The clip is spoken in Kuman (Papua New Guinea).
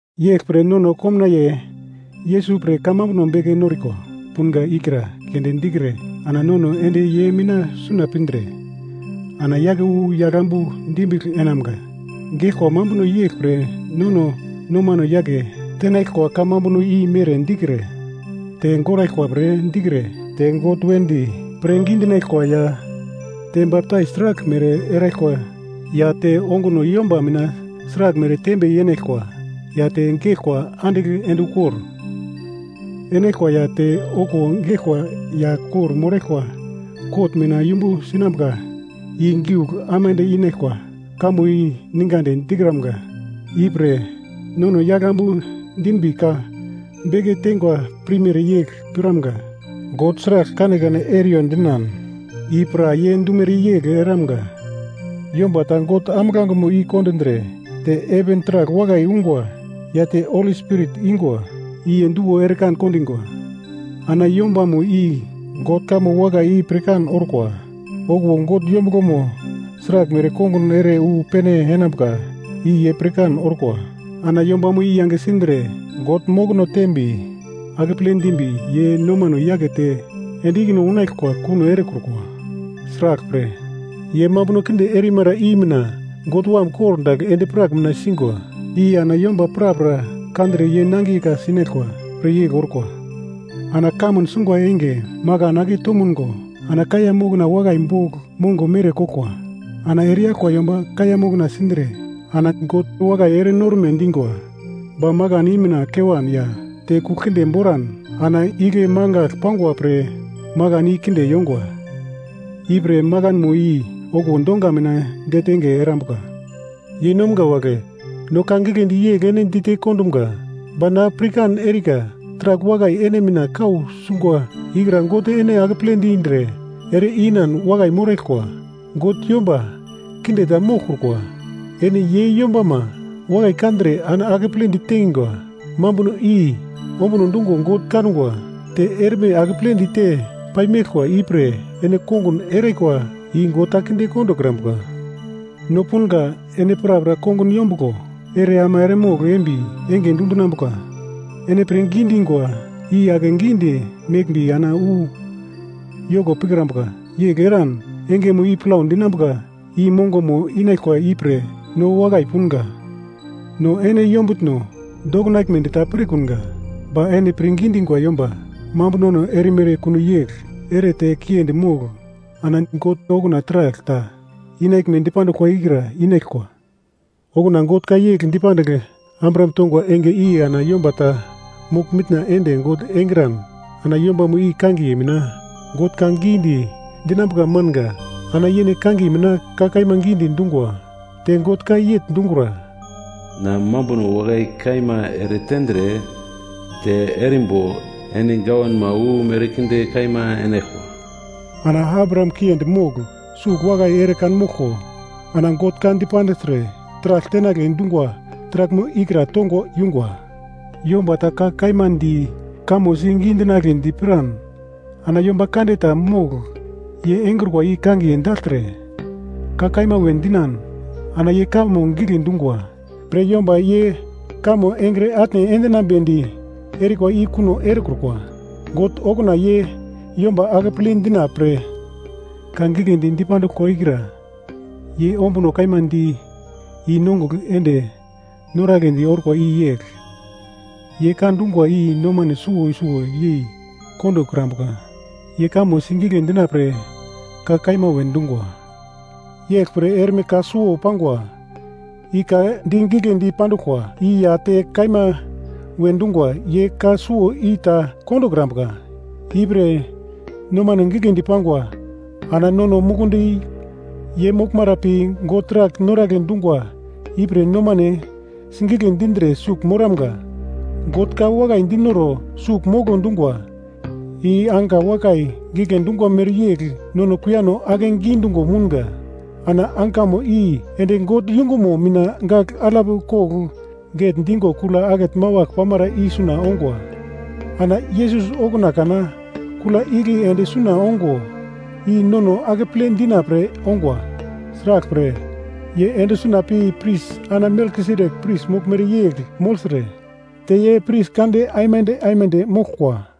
Yeglpre nono komnaiye Yesus pre kamambuno beke noriko punga ikra keunde dikre ana nono ende ye mina suna pindre, ana yake wu yagl ambu dimbigl enamga. Geglkwa mambuno yeglpre nono nomano yake tenaglkwa kamambuno i mere dikre, te goraglkwa pre dikre te God wedi pirngi dinaglkwa ya, te baptais sraglmere eraglkwa ya te onguno yomba mina sraglmere tembe yenaglkwa ya te geglkwa andigl ende ukor enaglkwa ya te okuwo geglkwa ya kor-moraglkwa kot mina yumbu sinambuka i giugl aimande inaglkwa kamo i ningadi dikramga, ipre nono yagl ambu dinbi ka beke teingwa pirmere yegl piramga. God sragl kanekane eriyo dinan i pra ye dumere yegl eramga. Yomba ta God ambuglangemo i-kondindre te heven taragl wakai ungwa ya te Holi Spirit ingwa i ye duwo ere kan kondingwa. Ana yombamo i God kamo wakai i pirkan orkwa. Okuwo God yombuglomo sraglmere kongun ere wu pene enambuka i ye pirkan orkwa Ana yombamo i yange sindre God mokono teimbi, akeple dimbi ye nomano yakete ende ikine unaglkwa, kuno erekrukwa, sraglpre, ye mambuno kinde erimara i mina God Wam kor dagl endi-prak mina singwa, i ana yomba prapra kandre ye nangiye ka-sinaglkwa pre yegl orkwa. Ana kamun sungwa enge makan ake tomungo ana kaiya mokna wakai bogl mongo mere koglkwa, ana ereyaglkwa yomba kaiya moknamo sindre ana God wakai ere norme dingwa. Ba makan i mina kewan ya te kugl kinde boran ana igle mangagl pangwa pre makan i kinde yongwa, ipre makanmo i okuwo donga mina detenge erambuka. Yeinomga wagle, no ka giglendi yegl ene dite kondumga. Ba na pirkan erika taragl wakai ene mina kau sungwa ikra God ene akeple dindre ere-inan wakai moraglkwa. God yomba kinde ta moglkrukwa, ene ye yombama wakai kandre ana akeple ditengwa mambuno i ombuno dungo God kangwa, te erme akeple dite pai meglkwa ipre ene kongun erikwa i God ta kinde kondokrambuka. No punga ene prapra kongun yombuglo ere ama eremogl embi enge dundinambuka, ene pirngi dingwa i ake gidi meglmbi ana wu yoko pikrambuka yegl eran engemo i plau dinambuka i mongomo inaglkwa ipre no wakai punga. No ene yombutno dokinaglmedi ta pirkunga, ba ene pirngi dingwa yomba mambunono erimere kuno yegl ere te kiendi mogl ana God okuna taragl ta inaglme dipanduglkwa ikra inaglkwa. Okuna God ka yegl dipandigl Abraham tongwa enge i ana yomba ta mogl-mitna ende God engran ana yombamo i kangiye mina God ka gidi dinambuka manga. Ana yene kangiye mina ka kaima gidi dungwa. Te God ka yegl dungura, “Na mambuno wakai kaima eretendre te erimbo ene gawanma wu merkinde kaima enaglkwa.” Ana Abraham kiendi mogl sugl wakai ere kanmoglko ana God ka dipandigltre taragl tenagle dungwa taraglmo ikra tongo yungwa. Yomba ta ka kaima di kamo si gidi dinagledi piran ana yomba kande ta mogl ye engrukwa i kangiye dagltre, ka kaima we dinan ana ye kamo gigle dungwa pre yomba ye kamo engre atne endinamnedi erikwa i kuno erekrukwa. God okuna ye yomba akeple dina pre ka giglendi dipanduglkwa ikra ye ombuno kaima di i-nongugl ende noragledi orkwa i yegl, ye ka dungwa i nomane suwo suwo yei kondokrambukra. Ye kamo sigigle dina pre ka kaima we dungwa. Yegl pre erme ka suwo pangwa, i ka di giglendi panduglkwa i ya te ka kaima we dungwa, ye ka suwo i ta kondokrambuka, ipre nomano giglendi pangwa ana nono mukundi ye moglmara pi, God taragl noragle dungwa ipre nomane sigigle dindre sugl moramga. God ka wakai dinoro sugl molo dungwa i anka wakai gigle dungwa mere yegl nono kuiyano akegi dungo mounga. Ana ankamo i ende God yungumo mina gagl alap kogl getndigo kula akete mawagl pamara i suna ongwa. Ana Yesus okuna kana kula igle ende suna ongwa i nono akeple dina pre ongwa. Sraglpre, ye ende suna pi pris ana Melkisedek pris moglmere yegl mogltre te ye pris kande aimande aimande moglkwa.